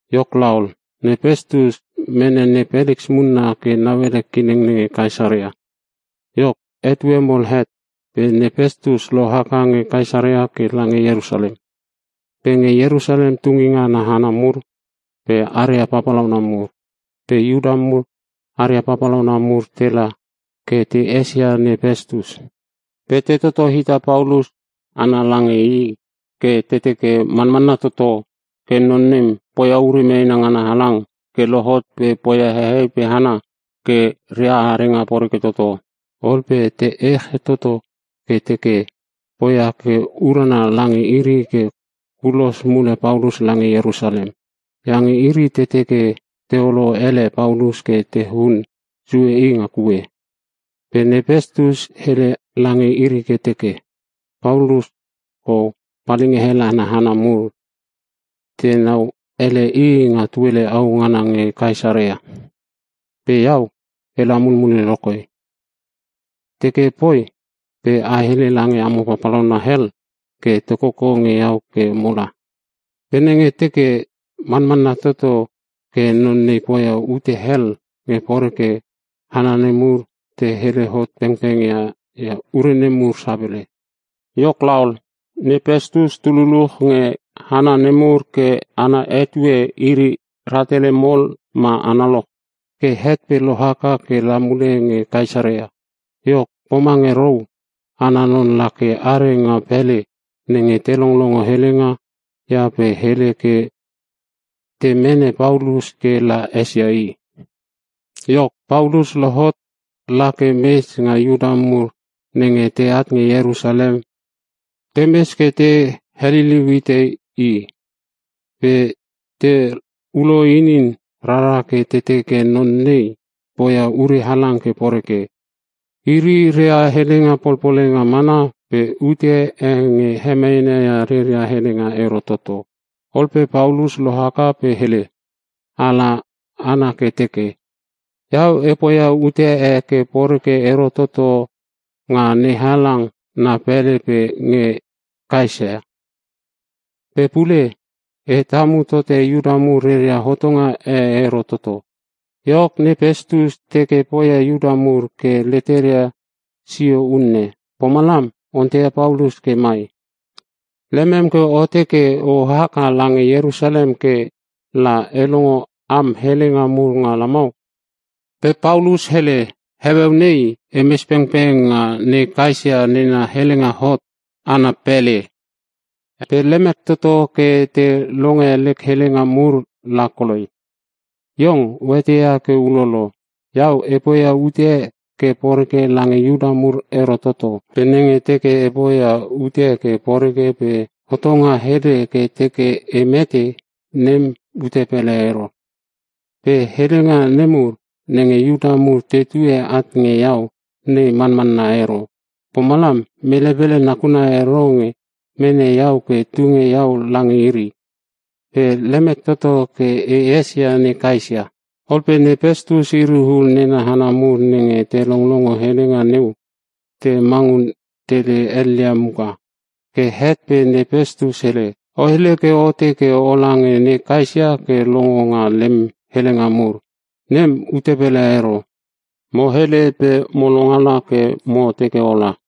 Iok laol, ne Pestus mene ne Peliks munna ke nauele kileng nenge Kaesarea. Iok etue mol het pe ne Pestus lohaka nge Kaesarea ke lange Ierusalem. Pe nge Ierusalem tunginga ana hana mur aria papalauna mur pe Iuta mur aria papalauna mur tela ke te esia ne Pestus. Pe te toto hita Paulus ana lange i ke te teke manmanna toto ke non nem poia ure meena ngana halang ke lohot pe poia hehei pe hana ke ria arenga poreke toto. Ol pe te ech tote i ke te teke poi ke urana lange iri ke kulos mule Paulus lange Ierusalem. Iange iri te teke teolo ele Paulus ke te hun sue i nga kue. Pe ne Pestus hele lange iri ke teke, “Paulus kou palinga hel ana hana mur tenau elele i nga tuele au ngana nge Kaesarea. Pe iau ela mulmule lokoi. Teke poi pe a hele lange amo papalauna hel ke te koko nge iau ke mola. Pe nenge teke manmanna toto ke non nei poia ute hel ke poreke, hana nemur te hele hot pengpeng ia ure nemur sapele.” Iok laol, ne Pestus tu luluch nge hana nemur ke ana etue iri rahtele mol ma analoch. Ke het pe lohaka ke la mule nge Kaesarea. Iok pomange rou ana non lake are nga pele nenge te longlongo helenga ia pe hele ke te mene Paulus ke la esia i. Iok Paulus lohot la ke mes pe Iuta mur nenge teat nge Ierusalem te mes ke te heliliu hite i. Pe teulo inin rara ke te teke non nei poia ure halang ke poreke. Iri rea helenga polpolenga mana pe ute e nge hemeena ia reria helenga ero toto. Ol pe Paulus lohaka pe hele ala ana ke teke, “Iau e poia ute e ke poreke ero toto nga NeHalang na pele pe nge ne Kaesa. Pe pule e tamu tote Iuta mur reria hotonga e ero toto.” Iok ne Pestus teke poia Iuta mur ke leteria sio unne, pomalam onteia Paulus ke mai, “Lemem ke o teke o haka lange Ierusalem ke la e longe am helenga mur nga lamau?” Pe Paulus hele, “Heueu nei e mes pengpeng nga ne Kaesa nena helenga hot ana pele pe lemek toto ke te longe lek helenga mur la koloi. Iong o eteia ke ulolo. Iau e poia ute ke poreke lange Iuta mur ero toto. Pe nenge teke e poia ute ke poreke pe hotonga hele ke teke e mete, nem ute pele ero. Pe helenga nemur nenge Iuta mur tetue at nge iau nei manmanna ero, pomalam mele pele nakuna ero nge mene iau pe tunge iau lange iri. Pe lemek toto ke e esia ne Kaesa!” Ol pe ne Pestus iri ul nena hana mur nenge te longlongo helenga neu te mangun tele helia muka. Ke het pe ne Pestus hele, “O hele ke o teke o lange ne Kaesa ke longo nga lem helenga mur, nem ute pele ero. Mo hele pe mo longala ke mo teke ola!”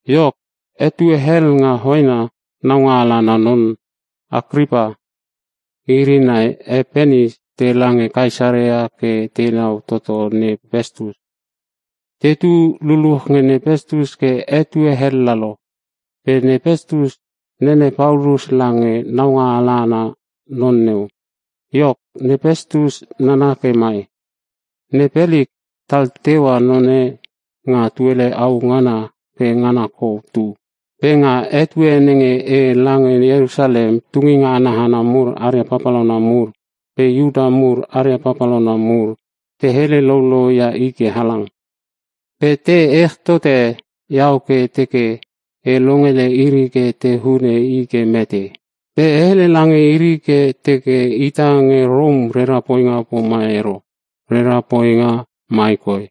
Iok, etue hel nga hoena naungaala ana non Akripa iri nai e Penis tela nge Kaesarea ke tenau toto ne Pestus. Te tu luluch nge ne Pestus ke etue hel lalo, pe ne Pestus nene Paulus lange naungaala ana non neu. Iok ne Pestus nana ke mai, “Ne Peliks tal teua none nga tuele au ngana ke ngana koi tu. Pe nga etue nenge e lange Ierusalem, tunginga ana hana mur aria papalauna mur pe Iuta mur aria papalauna mur, te hele loulouia i ke halang. Pe te ech tote iau ke te teke e longele iri ke te hune i ke mete. Pe e hele lange iri ke e teke ita nenge Rom rera poinga pomam ero, rera poinga mai koi: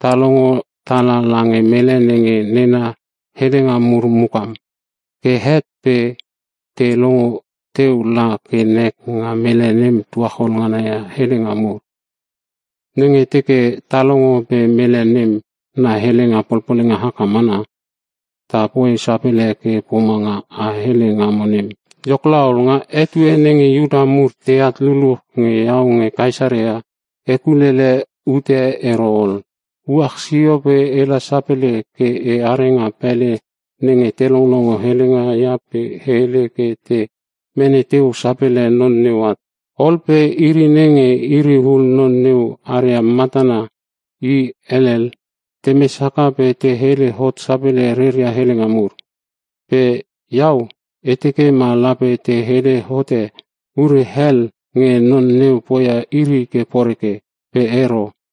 Ta longo tala langa mele nem nena helenga mur mukam. Ke het pe ta longo teu la ke nek nga mele nem tuachol ngana ia helenga mur. Nenge teke ta longo pe mele nem na helenga polpolenga haka mana, ta poi sapele i ke pomanga a hele ngamo nem. Iok laol, nga etue nenge Iuta mur teat luluch nge iau nge Kaesarea, e kulele ute ero ol. Uach sio pe ela sapele ke e are nga pele nenge te longlongo helenga ia pe e hele ke te mene teu sapele non neu at. Ol pe iri nenge iri ul non neu aria matana i elel, temes haka pe te hele hot sapele reria helenga mur. Pe iau e teke ma lape te hele hote ure hel nge non neu poia iri ke poreke, pe ero.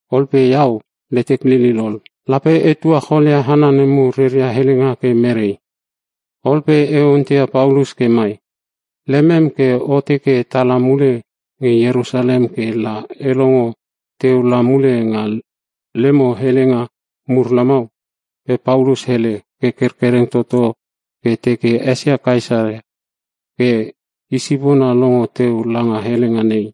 Ol pe iau letek lilil ol, lape e tuacholia hana nemur reria helenga ke merei? Ol pe e onteia Paulus ke mai, ‘Lemem ke o teke tala mule nge Ierusalem ke la e longo teu la mule nga lemo helenga mur lamau?’ Pe Paulus hele ke kerkereng toto ke teke esia ne Kaesa ke isipona longo teu langa helenga nei.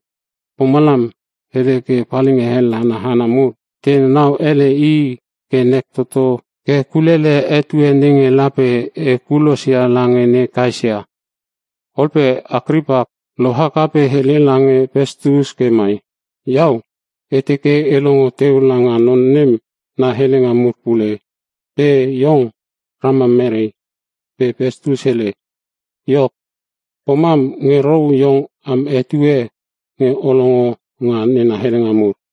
Pomalam e hele ke palinga hel ana hana mur tenau ele i ke nek toto ke kulele etue nenge lape e kulosia lange ne Kaesa.” Ol pe Akripa lohaka pe hele lange Pestus ke mai, “Iau e teke e longo teu langa non nem na helenga mur pule, pe iong ramam mere?” Pe Pestus hele, “Iok, pomam nge rou iong am etue nge o longo nga nena helenga mur.”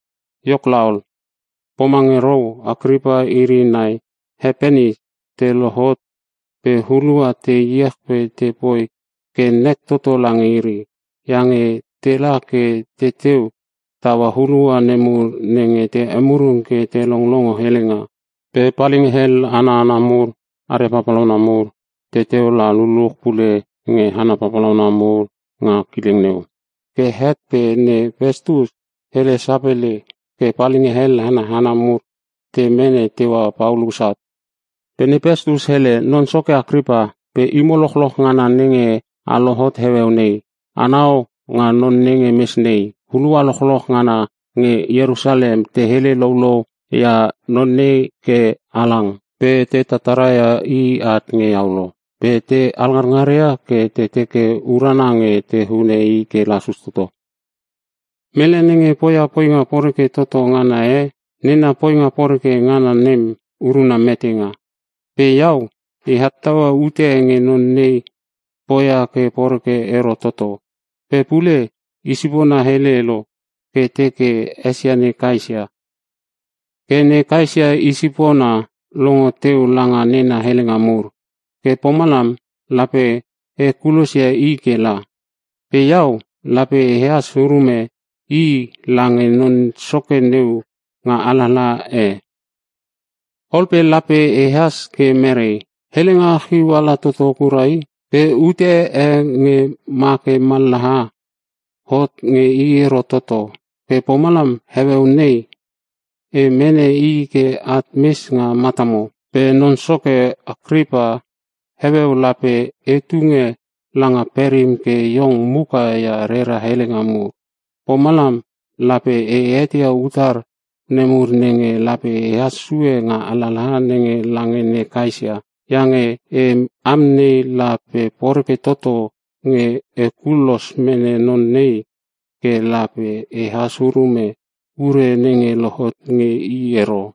Iok laol, pomange rou Akripa iri nai he Penis te lohot pe hulua te iech pe tepoi ke nek toto lange iri. Iange tela ke teteu taua hulua nemur nenge te emurung ke te longlongo helenga. Pe palinga hel ana hana mur aria papalauna mur teteu la luluch pule nge hana papalauna mur nga kileng neu. Ke het pe ne Pestus hele sapele ke palinga hel ana hana mur te mene teua Paulus at. Pe ne Pestus hele, “Non soke Akripa pe imo lochloch ngana nenge a lohot heueu nei, anau nga non nenge mes nei. Hulua lochloch ngana nge Ierusalem te hele loulou ia non nei ke halang. Pe te tataraia i at nge iau lo, pe te alngarngaria ke te teke urana nge te hune i ke lasus toto. Mele nenge poia poinga poreke toto ngana e, nena poinga poreke ngana nem uruna metenga. Pe iau e hottaua ute nge non nei poia ke poreke ero toto. Pe pule isipona hele lo ke teke esia ne Kaesa. Ke ne Kaesa i sipona longo teu langa nena helenga mur. Ke pomalam lape e kulosia i ke la. Pe iau lape ehas urume i lange non soke neu nga alalaha e. Ol pe lape ehas ke mere? Helenga chiu ala toto kura i. Pe ute e nge make mallaha hot nge i ero toto. Ke pomalam heueu nei e mene i ke at mes nga matamo. Pe non soke Akripa, heueu lape e tunge langa perim ke iong muka ia rera helenga mur. Pomalam lape e eteia utar nemur nenge lape ehas sue nga alalaha nenge lange ne Kaesa. Iange e amnei la pe poreke toto nge e kulos mene non nei ke la pe ehas ururume ure nenge lohot nge i ero.”